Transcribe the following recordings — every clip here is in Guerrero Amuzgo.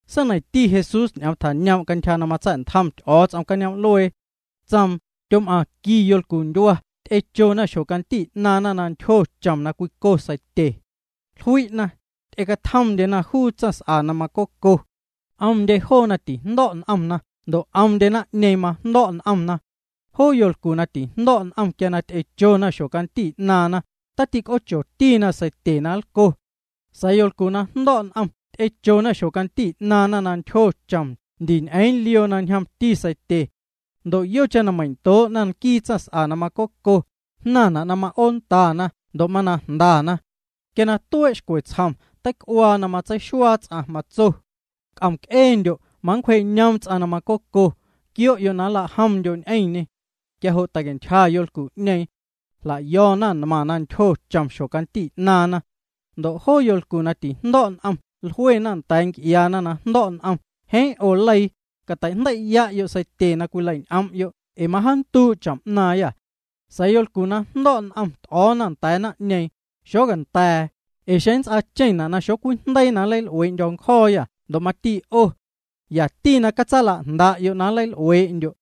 ’Seineiⁿti Jesús ñ'oom tjañoom' cantyja na matsa̱'ntjom Ty'o̱o̱ts'om cañoom'luee. Tsoom: —Tyom'aⁿ qui yolcundyua ty'echona xjocanti 'naaⁿna na ntyjo chom na cwico seitye. Jlui'na, ty'ecatjomndyena juu tsaⁿs'a na macoco. 'Omndye joona tijndo̱' n'omna ndo' 'omndye naⁿ'ñeeⁿ majndo̱' n'omna. Joo yolcu na tijndo̱' n'om quia na ty'echona xjocanti 'naaⁿna, tatic'oochotina seitye na nlco. Sa̱a̱ yolcu na jndo̱' n'om ty'echona xjocanti 'naaⁿna na ntyjo chom ndi ñ'eeⁿ lioo na ñjomti seitye. Ndo' yocheⁿ na meindoo'na nquii tsaⁿs'a na macoco, jnaⁿna' na ma'oondana ndo' mana jndana. Quia tuee' xcwe tsjom, teic'uaa na matseixuaa ts'aⁿ. Matso: “C'om'c'eendyo', macwjee'cañoom ts'aⁿ na macoco. Quio'yo' na nlajomndyo' ñ'eⁿñê.” Quia jo' tei'cantyja yolcu'ñeeⁿ. Jla'yo̱na nmaⁿ na ntyjo chom xjocanti 'naaⁿna. Ndo' joo yolcu na tijndo̱' n'om jluena nda̱a̱ nc'iaana na jndo̱' n'om: “Jeeⁿ 'o leii, cateijndei'ya'yo' seitye na cwilei'ñ'om'yo' ee majaanduu' chom 'naaⁿyâ.” Sa̱a̱ yolcu na jndo̱' n'om t'o̱o̱na nda̱a̱ naⁿ'ñeeⁿ: “Xonda̱a̱, ee xeⁿ nnts'aacheⁿna' na xocwijndeii na nleil'uee'ndyo̱ ncjo̱o̱yâ ndo' mati 'o. Yati catsalajnda'yo' na nleil'uee'ndyo'.”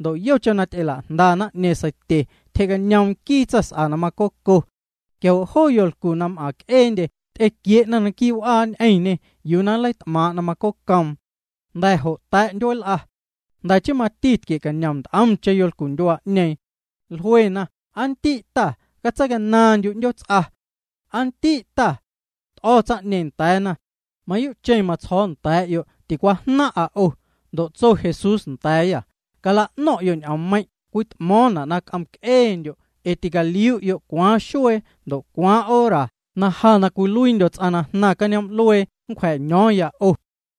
Ndo' yocheⁿ na ty'ela'jnda naⁿ'ñeeⁿ seitye, tyjee'cañoom nquii tsaⁿs'a na macoco. Quia jo' joo yolcu na m'aⁿc'eendye ty'equie'na quii' w'aa ñ'eⁿñê yuu na nleit'maaⁿ' na macocoom. Jnda̱ jo' ta̱' ndyueel'a. Jnda̱ chii mati tquie'cañom nt'omcheⁿ yolcundyua'ñeeⁿ. Jluena: “Aa ndi' ta, catseicanaaⁿndyu' 'ndyoots'a. Aa ndi' ta.” T'o̱ tsaⁿ'ñeeⁿ nda̱a̱na: “Mayuu'cheⁿ matsjo̱o̱ nda̱a̱'yo' ticwajnaⁿ'a 'o.” Ndo' tso Jesús nda̱a̱yâ: —Cala'no̱ⁿ'yo' na ñ'oommeiⁿ' cwit'mo̱o̱ⁿna' na c'om'c'eendyo', ee ticaliu'yo' cwaaⁿ xuee ndo' cwaaⁿ hora na ja na cwiluiindyo̱ ts'aⁿ na jnaⁿ cañoom'luee nncwja̱caño̱o̱ⁿya 'o.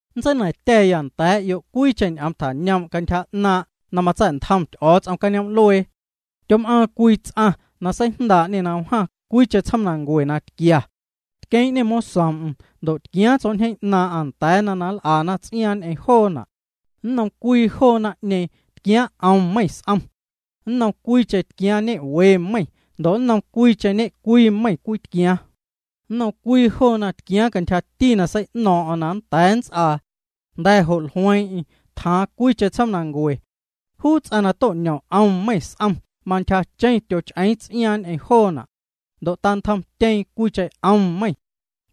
’Nntseina̱ⁿtya̱ nnda̱a̱'yo' cwiicheⁿ ñ'oom tjañoom' cantyja 'naaⁿ' na matsa̱'ntjom Ty'o̱o̱ts'om cañoom'luee. Tyom'aaⁿ cwii ts'aⁿ na seijndaa'ñe na wjaa cwiicheⁿ tsjoomnancue na tquia. Tqueeⁿ'ñê mosoom'm ndo' tquiaaⁿ tsjo̱'ñjeeⁿ 'naaⁿ'aⁿ nda̱a̱na na nl'ana ts'iaaⁿ ñ'eⁿ joona'. ’Nnom cwii joo naⁿ'ñeeⁿ tquiaaⁿ 'om meiⁿ s'om. Nnom cwiicheⁿ tquiaaⁿ ñe'we meiⁿ ndo' nnom cwiicheⁿ ñe'cwii meiⁿ cwii tquiaaⁿ. Tquiaaⁿ nnom cwii cwii joona cantyjati na sei'no̱o̱ⁿ'o̱ⁿ na nnda̱a̱ nnts'aa. Jnda̱ jo' jlueeⁿ'eⁿ, tjaaⁿ cwiicheⁿ tsjoomnancue. Juu ts'aⁿ na to'ñom 'om meiⁿ s'om mantyjacheⁿ tyoch'eeⁿ ts'iaaⁿ ñ'eⁿ joona'. Ndo' tantjomtyeeⁿ cwiicheⁿ 'om meiⁿ.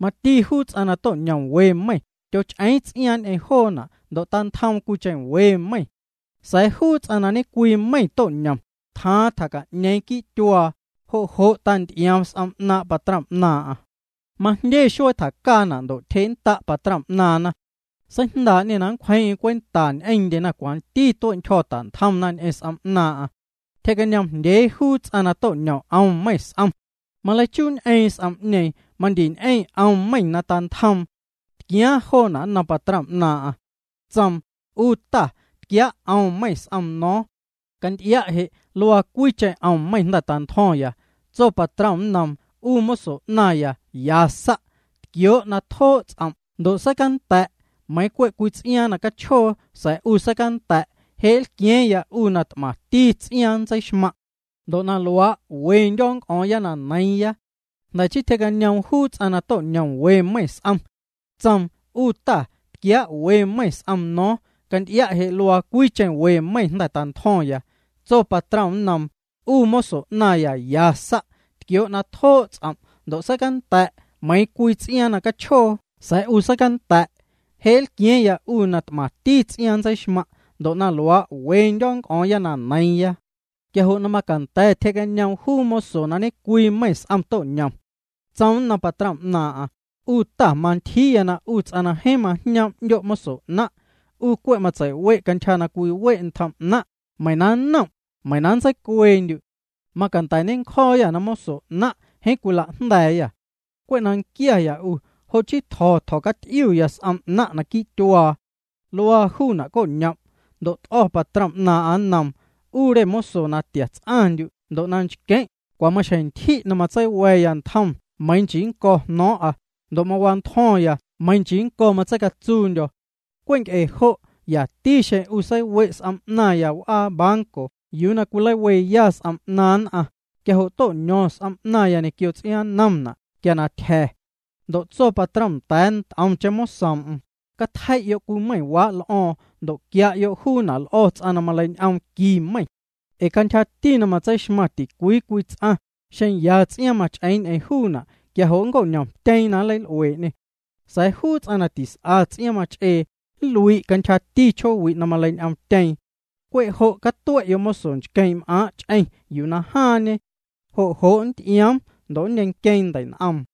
Mati juu ts'aⁿ na to'ñom we meiⁿ, tyoch'eeⁿ ts'iaaⁿ ñ'eⁿ joona' ndo' tantjoom cwiicheⁿ we meiⁿ. Sa̱a̱ juu ts'aⁿ na ñecwii meiⁿ to'ñom, tjaaⁿ tjaca'ñeeⁿ quii' tyuaa, jo' jo' tanty'ioom s'om 'naaⁿ' patrom 'naaⁿ'aⁿ. ’Majndye xuee tjacaana' ndo' tyjee'nnda' patrom 'naaⁿna. Seijndaa'ñê na nncwjeeⁿ'eⁿ cwenta ñ'eⁿndyena cwanti tue'ntyjo̱ ta'ntjomna ñ'eⁿ s'om 'naaⁿ'aⁿ. Tyjee'cañoomjndyee juu ts'aⁿ na to'ñom 'om meiⁿ s'om. Maleichuuñ'eeⁿ s'om'ñeeⁿ, mandi ñ'eⁿ 'om meiⁿ na tantjoom. Tquiaaⁿ joona' nnom patrom 'naaⁿ'aⁿ. Tsoom: “'U ta, tquiaa' 'om meiⁿ s'om no̱o̱ⁿ. Canty'ia' je' luaa cwiicheⁿ 'om meiⁿ na jnda̱ tantjo̱ⁿya.” Tso patrom nnoom: “'U moso 'naⁿya, ya sa'. Tquioo' na tjoo' ts'om' ndo' na seicanda̱'. Meiiⁿ cwe' cwii ts'iaaⁿ na cachjoo sa̱a̱ 'u seicanda̱'. Je' nlqua̱a̱ⁿya 'u na t'maⁿti ts'iaaⁿ nntseixmaⁿ'. Ndo' na luaa' wendyo̱ nnc'o̱o̱ⁿya na neiiⁿya.” Jnda̱ chii tyjee'cañoom juu ts'aⁿ na to'ñom we meiⁿ s'om. Tsoom: “'U ta, tquiaa' we meiⁿ s'om no̱o̱ⁿ. Canty'ia' je' luaa cwiicheⁿ we meiⁿ na jnda̱ tantjo̱ⁿya.” Tso patrom nnoom: “'U moso 'naⁿya, ya sa'. Tquioo' na tjoo' ts'om' ndo' na seicanda̱'. Meiiⁿ cwe' cwii ts'iaaⁿ na cachjoo sa̱a̱ 'u seicanda̱'. Je' nlqua̱a̱ⁿya 'u na t'maⁿti ts'iaaⁿ nntseixmaⁿ'. Ndo' na luaa' wendyo̱ nnc'o̱o̱ⁿya na neiiⁿya.” Quia jo' na macanda̱ tyjee'cañoom juu moso na ñe'cwii meiⁿ s'om to'ñom. Tsoom nnom patrom 'naaⁿ'aⁿ: “'U ta, mantyjiiya na 'u ts'aⁿ na jeeⁿ majñoom' 'ndyo' moso 'naⁿ'. 'U cwe' matsei'we' cantyja na cwiwe' ntjom 'naⁿ', meiⁿ na nnom', meiⁿ na nntseicueendyu'. Macanda̱ nencjo̱o̱yâ moso 'naⁿ' jeeⁿ cwilajnda̱a̱yâ. Cwe' na nquiaya 'u, jo' chii tjo̱, tjo̱caty'iuya s'om 'naⁿ' quii' tyuaa. Luaa juuna', co'ñom'.” Ndo' t'o̱ patrom 'naaⁿ'aⁿ nnoom: “'U re moso na tia ts'aⁿndyu' ndo' na nchqueⁿ', cwa maxjeⁿ ntyji' na matseiwa̱ya ntjom meiiⁿ nchii nnco̱ jno̱o̱ⁿ'a, ndo' mawantjo̱ⁿya meiiⁿ nchii nnco̱ matseicatsuundyo̱. Cwe' nc'e jo' yati xeⁿ 'u seiwe' s'om 'naⁿya w'aa banco yuu na cwileiweya s'om 'naaⁿ nn'aⁿ, quia jo' to'ño̱ⁿ s'om 'naⁿya ñequio ts'iaaⁿnnomna' quia na tyja̱.” Ndo' tso patrom nda̱a̱ nt'omcheⁿ mosoom'm: “Catjei'yo' cwii meiⁿwaa' l'o̱o̱ⁿ ndo' quia'yo' juuna' l'o̱ juu ts'aⁿ na maleiñ'oom qui meiⁿ. Ee cantyjati na matseixmaⁿ ticwii cwii ts'aⁿ, xeⁿ ya ts'iaaⁿ mach'eeⁿ ñ'eⁿ juuna' quia jo' nnco'ñomtyeeⁿ na nleil'uee'ñê. Sa̱a̱ juu ts'aⁿ na tis'a ts'iaaⁿ mach'ee, nlui' cantyjati chjoowi' na maleiñ'oomtyeeⁿ. Cwe' jo' catue'yo' moso nchqueeⁿ'm'aaⁿ' ch'eⁿ yuu na jaaⁿñe. Jo' jo' nnty'ioom ndo' nneiⁿnqueeⁿ ndei'n'oom.”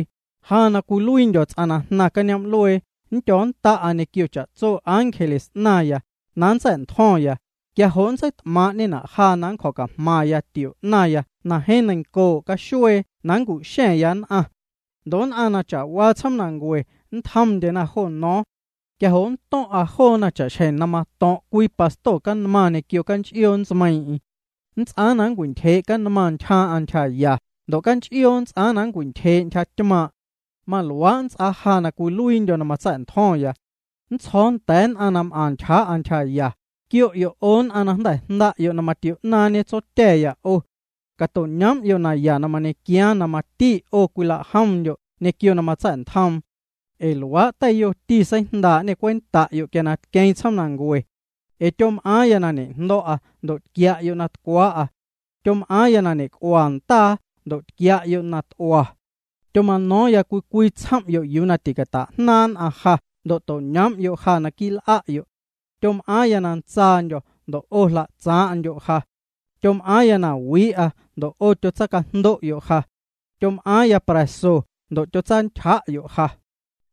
’Ja na cwiluiindyo̱ ts'aⁿ na jnaⁿ cañoom'luee, nndyo̱o̱nnda'a ñequio cha'tso ángeles 'naⁿya, na nntsa̱'ntjo̱ⁿya. Quia jo' nntseit'maaⁿ'ñena' ja na nncjo̱cajmaⁿ ntio 'naⁿya na jeeⁿ neiⁿncoo' caxuee na nncu'xa̱ⁿya nn'aⁿ. Ndo' nn'aⁿ na cha'waa tsjoomnancue nntjomndyena jo no̱o̱ⁿ. Quia jo' nnto̱ⁿ'a joona cha'xjeⁿ na mato̱ⁿ' cwii pasto canmaⁿ ñequio canch'ioo ntsmeiiⁿ'eⁿ. Nnts'aaⁿ na nncwintyjee' canmaⁿ ntyjaaⁿ'aⁿ ntyjaya ndo' canch'ioo nnts'aaⁿ na nncwintyjee' ntyjatymaaⁿ'. Maluaa' nnts'aa ja na cwiluiindyo̱ na matsa̱'ntjo̱ⁿya. Nntsjo̱o̱ nda̱a̱ nn'aⁿ na m'aⁿ ntyjaa'a ntyjaya: “Quio'yo' 'o nn'aⁿ na jnda̱ jnda'yo' na matio'naaⁿñe Tsotya̱ya 'o. Cato'ñoom'yo' naya na mañequiaaⁿ na mati 'o cwilajomndyo' ñequio na matsa̱'ntjoom. Ee luaa' teiyoti seijndaa'ñê cwenta'yo' quia na tqueeⁿ tsjoomnancue. Ee tyom'aaⁿya na ñejndo̱'a ndo' tquia'yo' na tcwaa'a. Tyom'aaⁿya na ñe'c'ua ndaa ndo' tquia'yo' na t'ua. Tyoma'no̱o̱ⁿya cwii cwii tsjom'yo' yuu na ticata'jnaaⁿ' nn'aⁿ ja ndo' to'ñoom'yo' ja naquii' l'a'yo'. Tyom'aaⁿya na ntsaandyo̱ ndo' 'o jla'tsaaⁿ'ndyo' ja. Tyom'aaⁿya na wii'a ndo' 'o tyotsacajndo'yo' ja. Tyom'aaⁿya pra̱so ndo' tyotsantyja'yo' ja.”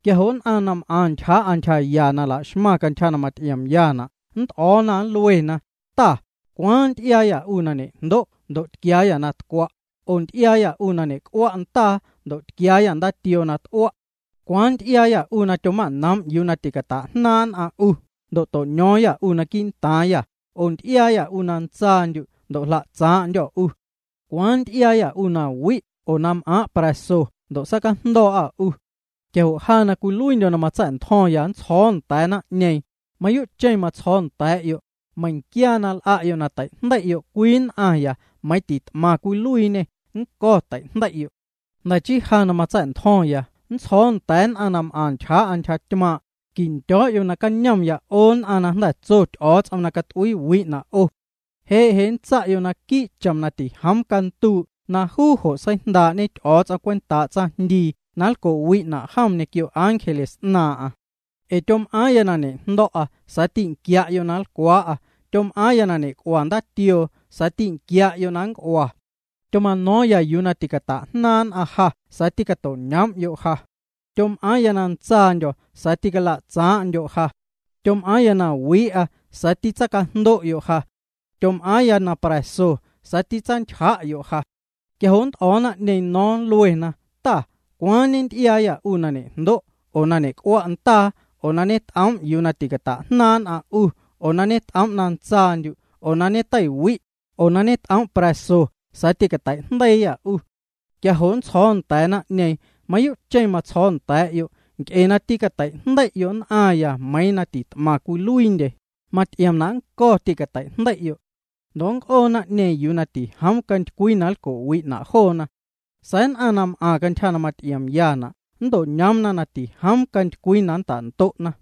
Quia jo' nn'aⁿ na m'aⁿ ntyjaa'a ntyjaya na la'xmaⁿna cantyja na maty'iomyana' nnt'o̱o̱na, nluena: “Ta, ¿cwaaⁿ nty'iaayâ 'u na ñe'jndo' ndo' tquiaayâ na tcwa', oo nty'iaayâ 'u na ñe'c'ua' ndaa ndo' ñetquiaayâ ndaatioo na t'ua'? ¿Cwaaⁿ nty'iaayâ 'u na tyoma'noom' yuu na ticata'jnaaⁿ' nn'aⁿ 'u ndo' to'ño̱o̱ⁿyâ 'u quii'ntaaⁿyâ, oo na nty'iaayâ 'u na ntsaandyu' ndo' jla'tsaaⁿ'ndyô̱ 'u? ¿Cwaaⁿ nty'iaayâ 'u na wi' oo na m'aaⁿ' pra̱so ndo' sacajndo̱o̱'â 'u?” Quia jo' ja na cwiluiindyo̱ na matsa̱'ntjo̱ⁿya nntsjo̱o̱ nda̱a̱ naⁿ'ñeeⁿ: “Mayuu'cheⁿ matsjo̱o̱ nda̱a̱'yo', meiⁿquia na l'a'yo' na teijndei'yo' cwii nn'aⁿya nmeiiⁿ na tit'maⁿ cwiluiiñe, nnco̱ teijndei'yo'.” ’ Jnda̱ chii, ja na matsa̱'ntjo̱ⁿya nntsjo̱o̱ nda̱a̱ nn'aⁿ na m'aⁿ ntyjaa'a ntyjatymaaⁿ': “Quindyo̱o̱'yo' nacañomya 'o nn'aⁿ na jnda̱ tso Ty'o̱o̱ts'om na cat'uiiwi'na' 'o. Je' je' nntsa'yo' quii' chom na tijoom canduu' na juu jo' seijndaa'ñe Ty'o̱o̱ts'om cwentaa' tsaⁿjndii na nlco'wi'na' jom ñequio ángeles 'naaⁿ'aⁿ. Ee tyom'aaⁿya na ñe'jndo̱'a sa̱a̱ tînquia'yo' na nlcwaa'a. Tyom'aaⁿya na ñe'c'ua ndaatioo sa̱a̱ tînquia'yo' na nnc'ua. Tyoma'no̱o̱ⁿya yuu na ticata'jnaaⁿ' nn'aⁿ ja sa̱a̱ tîcato'ñoom'yo' ja. Tyom'aaⁿya na ntsaandyo̱ sa̱a̱ tîcala'tsaaⁿ'ndyo' ja. Tyom'aaⁿya na wii'a sa̱a̱ tîcatsajndo'yo' ja. Tyom'aaⁿya na pra̱so sa̱a̱ tîcatsantyja'yo' ja.” Quia jo' nnt'o̱o̱ naⁿ'ñeeⁿ no̱o̱ⁿ, nluena: “Ta, ¿cwaaⁿ ñenty'iaayâ 'u na ñe'jndo', oo na ñe'c'ua' ndaa, oo na ñeto'noom' yuu na ticata'jnaaⁿ' nn'aⁿ 'u, oo na ñet'oom' na ntsaandyu', oo na ñeteiwi', oo na ñet'oom' pra̱so sa̱a̱ tîcatei'jndeiiyâ 'u?” Quia jo' nntsjo̱o̱ nda̱a̱ naⁿ'ñeeⁿ: “Mayuu'cheⁿ matsjo̱o̱ nda̱a̱'yo', nc'e na tîcateijndei'yo' nn'aⁿya nmeiiⁿ na tit'maⁿ cwiluiindye, maty'iomna' nnco̱ tîcatei'jndei'yo'.” Ndo' nnc'oo naⁿ'ñeeⁿ yuu na tijoom cantycwii na nlco'wi'na' joona. Sa̱a̱ nn'aⁿ na m'aⁿ cantyja na maty'iomyana' nnto'ñoomna na tijoom cantycwii na nnta'ndo'na.